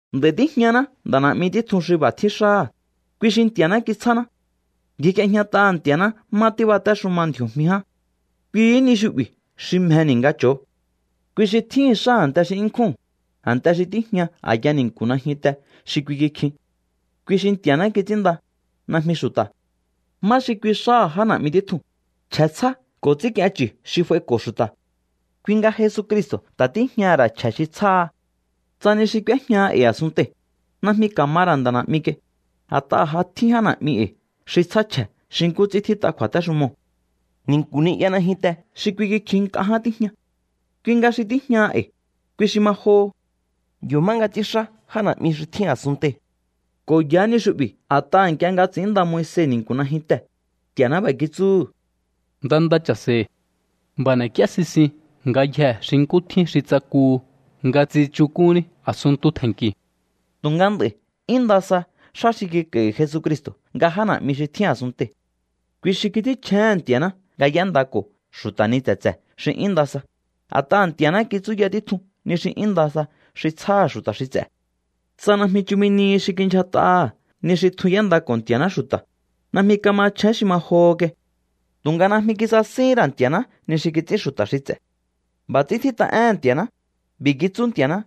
Nd'a̱i̱ tíjñaná nda̱ na̱'mi títjun xi b'a̱ tjín xáha̱, kui xi Nti̱a̱ná kitsjáná. Ngjik'iejñat'aha̱ Nti̱a̱ná má tíbatéxuma ndji̱o̱jmi ján. Kuihí ni xu'bi̱ xi mjeni̱ nga cho̱o. Kui xi tjíhi̱n xá a̱nte xi 'yún nkjúu̱n, a̱nte xi tíjña a̱ya ni̱nku̱ najyunte xi kui kikjin. Kui xi Nti̱a̱ná kits'ínnda, najmi xu̱ta̱. ¿Má xi kui xáha̱ já na̱'mi títjun? Chje̱ tsjá ko̱ ts'i̱ínk'ien chu̱ xi f'aiko̱ xu̱ta̱. Kui nga Jesucristo̱ ta̱ tíjñaha̱ ra̱ chje̱ xi tsjáha. Tsa ni xi k'úéjñaha e̱i̱ a̱sunntei̱, najmi ka̱ ma ra̱ nda̱ na̱'mi kai, a̱t'aha̱ ja tjín já na̱'mi e̱i̱ xi tsjá chje̱ xi nkú ts'ín tjít'a kju̱a̱téxumoo̱. Ni̱nku̱ ni'ya najyunte xi kui kikjihin nk'a ján tíjña. Kui nga xi tíjñaha e̱i̱, kui xi ma joho. Yo̱ má nga ts'ínxá já na̱'mi xi tjín a̱sunntei̱. Ko̱ yaá ni xu'bi̱ a̱t'aha̱ nk'ie nga ts'i̱ínnda Moise ni̱nku̱ najyuntee̱, Nti̱a̱ná b'a̱ kitsúhu̱: “Nda nda cha̱se̱i̱. B'a̱ n'e̱k'íé sisin ngayjee̱ xi nkú tjín xi tsakuhu nga tsichuk'unní a̱sunntu tje̱nnki̱u̱.” Tu̱nga nd'a̱i̱ 'yún nda sa xá xi kik'a̱i̱hi̱ Jesucristo̱ nga já na̱'mi xi tjín a̱sunntei̱. Kui xi kits'ínchjéhe̱n Nti̱a̱ná nga y'éndako̱ xu̱ta̱ ni tse̱tse̱ xi 'yún nda sa, a̱t'aha̱ Nti̱a̱ná kitsúya títjun ni xi 'yún nda sa xi tsjáha̱ xu̱ta̱ xi ts'e̱. Tsa najmi chumi nihi xi kindyjat'aha̱ ni xi tjun y'éndako̱ Nti̱a̱ná xu̱ta̱, najmi ka̱machjén xi ma joho kai. Tu̱nga najmi kisasihín ra̱ Nti̱a̱ná ni xi kits'ín xu̱ta̱ xi ts'e̱. B'a̱ ts'ín tjít'a éhe̱n Nti̱a̱ná: B'i̱ kitsú Nti̱a̱ná: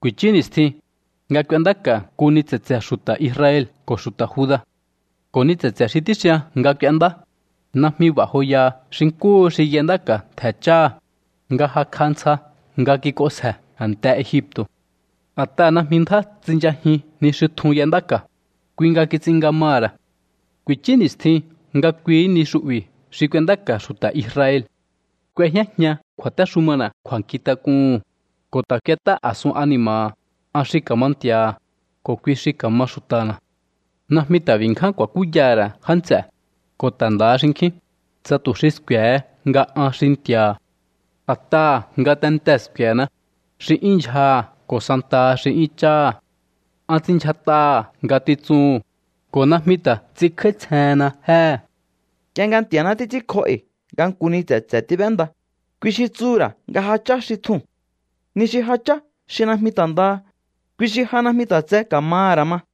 Ku̱i̱chú ni̱stjin, nga k'uendáka̱ nku ni tse̱tse̱ xu̱ta̱ Israel ko̱ xu̱ta̱ Juda. Ko̱ ni tse̱tse̱ xi tíxian nga k'uendá, najmi b'a̱ joyaha xi nkúhu xi y'endáka̱ ntje̱ cháha̱, nga jakj'a ntsja nga kik'onsje̱ a̱nte Egipto̱. A̱t'aha̱ najmi ndjá tsinchajin ni xi tjun y'endáka̱, kui nga kits'in nga maha̱ ra̱. Ku̱ichú ni̱stjin nga kuihí ni xu'bi̱ xi k'uendáka̱ xu̱ta̱ Israel. K'uejñájian kju̱a̱téxumana̱ kju̱a̱nkjint'ak'uhu̱n, ko̱ ta̱ k'uet'á a̱sun ani̱ma̱ha̱. An xi ka̱ma Nti̱a̱ha̱, ko̱ kui xi ka̱ma xu̱ta̱na̱. Najmi ta̱ b'i̱ ngján ku̱a̱kúyaha̱ ra̱ já nts'e̱, ko̱ ta̱ ndaha xinkjín, tsa tu̱ xi sku̱e̱he nga an xi Nti̱a̱ha̱. A̱t'aha̱ ngatentee̱ sku̱e̱na, xi 'yún ndyjaha̱ ko̱ santaha xi 'yún cháha̱. An ts'inndyjat'aha̱ ngatitsuhu̱n, ko̱ najmi ta̱ ts'inkj'áítsjehenna jéhe̱. Nk'ie nga Nti̱a̱ná títs'ínkjó e̱i̱ nga nku ni tse̱tse̱ tíb'énda, kui xi tsuhu̱ ra̱ nga ja chá xi tjuu̱n. Ni xi ja chá xi najmi ta̱ ndaha, kui xi ja najmi ta̱ tse ka̱maha̱ ra̱ ma.